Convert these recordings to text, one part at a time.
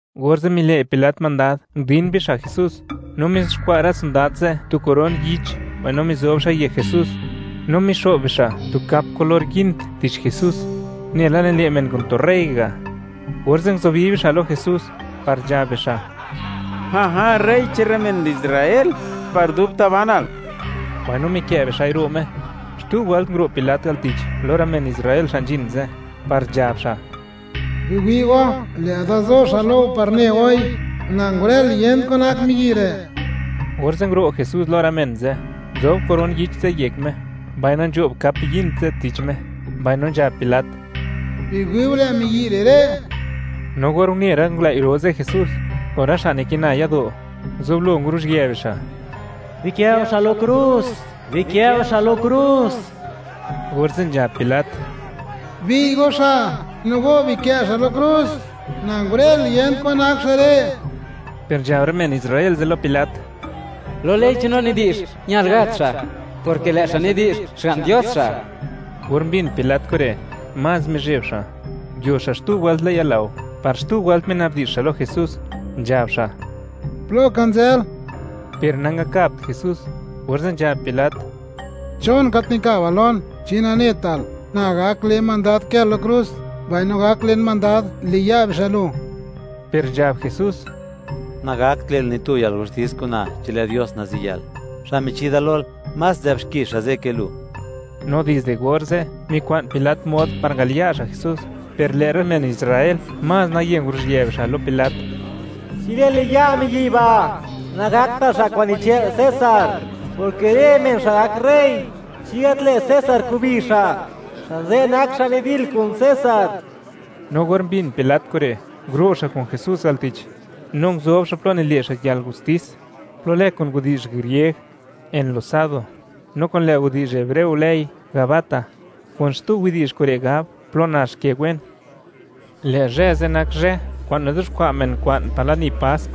Orze' mile' Pilat mandad, ndin bixa' Jesús, no mizuxkwa' rë sondad ze' tu koron yich, mbaino mizo'b xa'i yek Jesús, mbaino mixo'b bixa' tu kap kulor yind tich Jesús, nela nile' men kun tu rey ga', orze' nguzubi bixa' lo Jesús par nzhab bixa': ―¡Rey che'n rë men Israel, par dubta' banal! Mbaino mikë' bixa'i ro' Me. Xtu wëlt nguro' Pilat al tich, lo rë men Israel xa' nzhin ze', par nzhab xa': ―Biwi' go, lë'da zo xa' lo go par ne goi, na ngurël, yent kwan nak miyi' re'. Orze' nguro' Jesús lo rë men ze', nzob koron yich ze' yek Me, mbaino nzho'b kap yind ze' tich Me, orze' nzhab Pilat: ―¡Biwi'u! ¡Lë' miyi' re' re'! No or une rë ngulëi' ro ze' Jesús, kun rë xa' nikina yado', nguzublo nguruzhië bixa': ―¡Bikë'u xa' lo krus! ¡Bikë'u xa' lo krus! Orze' nzhab Pilat: ―Bi'y go xa', no go bikë' xa' lo krus; na ngurël, yent kwan nak xa' re'. Per nzhab rë men Israel ze' lo Pilat: ―¡Lo ley che'n no nidi'zh, ñal gat xa', porke lë' xa' nidi'zh, Xga'n Dios xa'! Or mbin Pilat kure', más mizheb xa'; nguio xa' xtu wëlt le'n yalao par xtu wëlt mina'bdi'zh xa' lo Jesús, nzhab xa': ―¿Plo ka nzël? Per nangakabt Jesús, orze' nzhab Pilat: ―¿Chon gat nikabal lon? ¿Chi nanetal, na gak le mandad kël lo krus, mbaino gak len mandad, liya' bixa' lu? Per nzhab Jesús: ―Nagakt le'l ni tu yalgustis kun na chi lë' Dios naziyël; xa' michi da lol, más nzë'b xki xa' ze' ke lu. No dizde orze', mikwa'n Pilat mod par ngaliya' xa' Jesús, per lë' rë men Israel más naye nguruzhië bixa' lo Pilat: ―¡Chi lë'l liya' miyi' ba', nagaktal xa' kwa'n nichë'l César, porke rë men xa' gak rey, chi gat lë't César kubi xa', xa' ze' nak xa' nidil kun César! No or mbin Pilat kure', nguro' xa' kun Jesús al tich no nguzob xa' plo nile' xa' yalgustis, plo lë kun widi'zh grieg, Enlosado, no lë' kun widi'zh hebreo lëi, Gabata (kun xtu widi'zh kure' gab, Plo Nax Ke Wen). Lë' zhë ze' nak zhë kwa'n nizuxkwa' men kwa'n par lani Pask,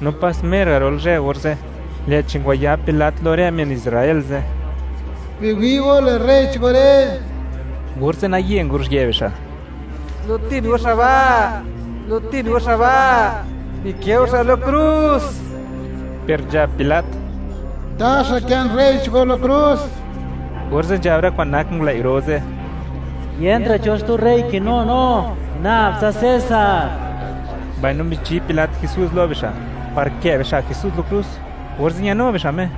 no pas mer garol zhë orze', lë'chi ngwayab Pilat lo rë men Israel ze': ―¡Biwi' go, lë' rey che'n go re'! Orze' naye nguruzhië bixa': ―¡Gulutin go xa' ba'! ¡Gulutin go xa' ba'! ¡Bikë' go xa' lo krus! Per nzhab Pilat: ―¿Taxa kë'n rey che'n go lo krus? Orze' nzhab rë kwa'n nak ngulëi' ro ze': ―¡Yentra' cho xtu rey kinu no, nab tsa César! Mbaino michi Pilat Jesús lo bixa', par kë' bixa' Jesús lo krus, orze' ñanu bixa' Me.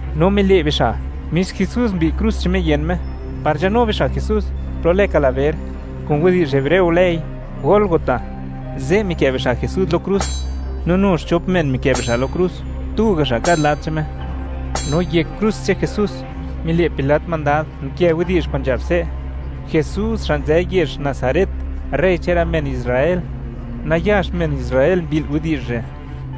No mile' bixa' mis Jesús mbi'y krus che'n Me yën Me, par nzhanu bixa' Jesús plo lë Kalaber (kun widi'zh hebreo lëi Gólgota), ze' mikë' bixa' Jesús lo krus, no nu xchop men mikë' bixa' lo krus; tu ga' xa' kad lad che'n Me. No yek krus che'n Jesús, mile' Pilat mandad nkë widi'zh kwa'n nzhab se': “Jesús xa' nzë yezh Nazaret, rey che'n rë men Israel.” Nayax men Israel mbi'l widi'zh re',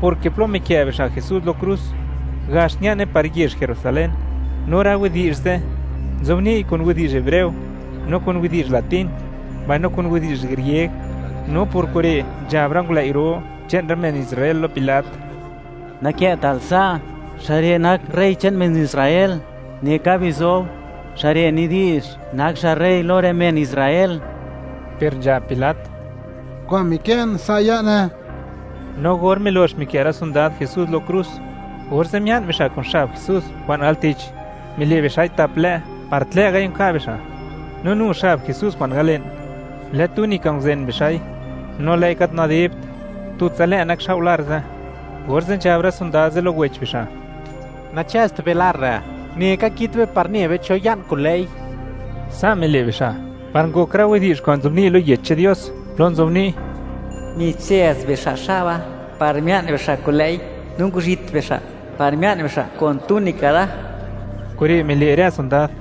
porke plo mikë' bixa' Jesús lo krus, gax ña'ne par yezh Jerusalén, no rë widi'zh ze' nzobni'y kun widi'zh hebreo, no kun widi'zh latín, mbaino kun widi'zh grieg. No por kure' nzhab rë ngulëi' ro che'n rë men Israel lo Pilat: ―Nakë'tal sa': “Xa' re' nak rey che'n rë men Israel”, neka bizob: “Xa' re' nidi'zh, nak xa' rey lo rë men Israel.” Per nzhab Pilat: ―Kwa'n mikë'n, sa' ya'ne. No or milox mikë' rë sondad Jesús lo krus, orze' mia'n bixa' kun xab Jesús kwa'n al tich, mile' bixa'i tap lë' par tlë'gai' nka' bixa'; no nu xab Jesús kwa'n al le'n, lë túnica, nguzen bixa'i, no lë'i gat nadibt, tutsa lë' nakxao' lar ze', orze' nzhab rë sondad ze' lo wech bixa': ―Nachëzt be lar re'; neka kit be par ne be, cho ya'n kun lë'i, Sa' mile' bixa' par ngok rë widi'zh kwa'n nzobni' lo Yech che'n Dios plo nzobni': Michëz bixa' xaba par mia'n bixa' kun lë'i, no nguzhit bixa' par mia'n bixa' kun túnica da. Kure' mile' rë sondad,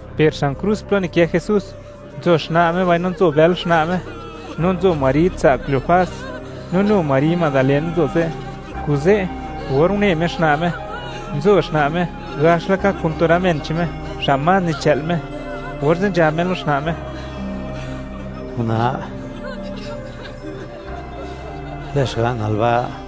per xan krus plo nikë Jesús, nzo xna' Me mbaino nzo bël xna' Me, no nzo Mari tsa' Cleofas, no nu Mari Madalén nzo ze'. Kuze', or une Me xna' Me, nzo xna' Me gax laka kun tu rë men che'n Me xa' más nichë'l Me, orze' nzhab Me lo xna' Me: ―Una', lë' xga'nal ba'.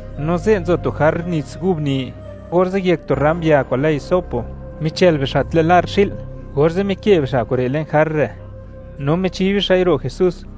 No ze' nzo tu jar nits gub ni, orze' yek tu ram ya kwa'n lë hisopo, michël bixa' tlë' lar xi'l, orze' mikë bixa' kure' le'n jar re', no michi bixa'i ro' Jesús.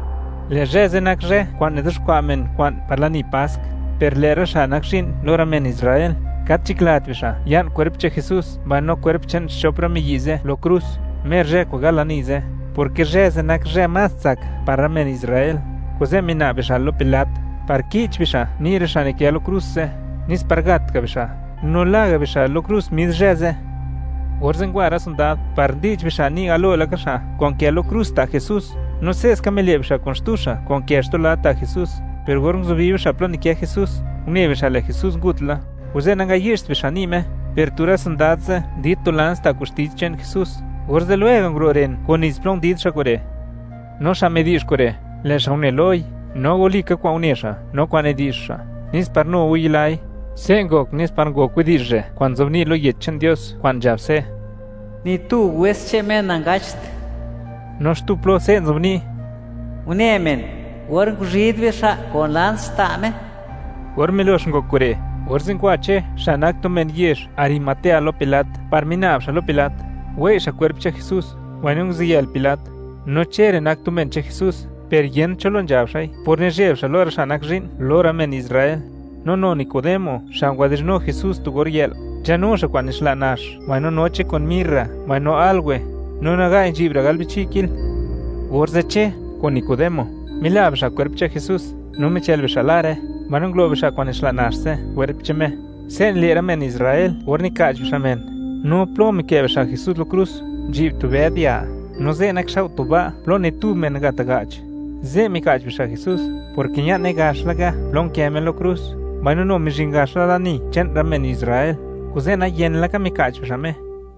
Lë' zhë ze' nak zhë kwa'n nizuxkwa' men kwa'n par lani Pask, per lë' rë xa' nak zhi'n lo rë men Israel, gat nzhaklat bixa' ya'n kwerp che'n Jesús, mbaino kwerp che'n xchop rë miyi' ze' lo krus, mer zhë kwa'n gal lani ze', porke zhë ze' nak zhë más tsak par rë men Israel. Kuze' mina'b bixa' lo Pilat, par ki'ch bixa' ni' rë xa' nikë lo krus ze', nes par gat ga' bixa', no la ga' bixa' lo krus mis zhë ze'. Orze' ngwa rë sondad par ndi'ch bixa' ni' galo laka xa' kwa'n nkë lo krus ta' Jesús, no sa' ska mile' bixa' kun xtu xa' kwa'n nkë xtu lad ta' Jesús, per or nguzubi bixa' plo nikë Jesús, une bixa', lë' Jesús ngut la. Kuze' nangayi'cht bixa' ni' Me, per tu rë sondad ze' ndid tu lans ta' koxti che'n Jesús, orze' lwega' nguro' ren kun nits plo ndid xa' kure'. No xa' midi'zh kure', lë' xa' une loi, no walika kwa'n une xa' no kwa'n nidi'zh xa', nes par nu go, yilai. Se' ngok nes par ngok widi'zh re' kwa'n nzobni' lo Yech che'n Dios kwa'n nzhab se': “Ni tu wes che'n Me nangacht.” No xtu plo se' nzobni': “Une men or nguzhid bixa' kun lans ta' Me.” Or milox ngok kure', orze' ngwa Che xa' nak tu men yezh Arimatea lo Pilat par mina'b xa' lo Pilat, wei' xa' kwerp che'n Jesús, mbaino nguziyël Pilat. No Che re' nak tu men che'n Jesús, per yent cho lo nzhabt xa'i por nizheb xa' lo rë xa' nak zhi'n lo rë men Israel. No nu Nicodemo xa' ngwadi'zhnu Jesús tu or yë'l, nzhanu xa' kwa'n nixla' nax mbaino noche kun mirra mbaino áloe; no naga'i nzhi'bra' gal bichi' kil. Orze' Che kun Nicodemo mila bixa' kwerp che'n Jesús, no michël bixa' lare, mbaino ngulo bixa' kwa'n nixla' nax ze' kwerp che'n Me. Se' nile' rë men Israel or nika'ch bixa' men. No plo mikë' bixa' Jesús lo krus, nzhi'b tu bëd ya, no ze' nakxao' tu ba' plo ni tu men nagat ga'ch. Ze' mika'ch bixa' Jesús, porke ña'ne gax laka plo nkë Me lo krus, mbaino nu mizhin gax la lani che'n rë men Israel, kuze' nayen laka mika'ch bixa' Me.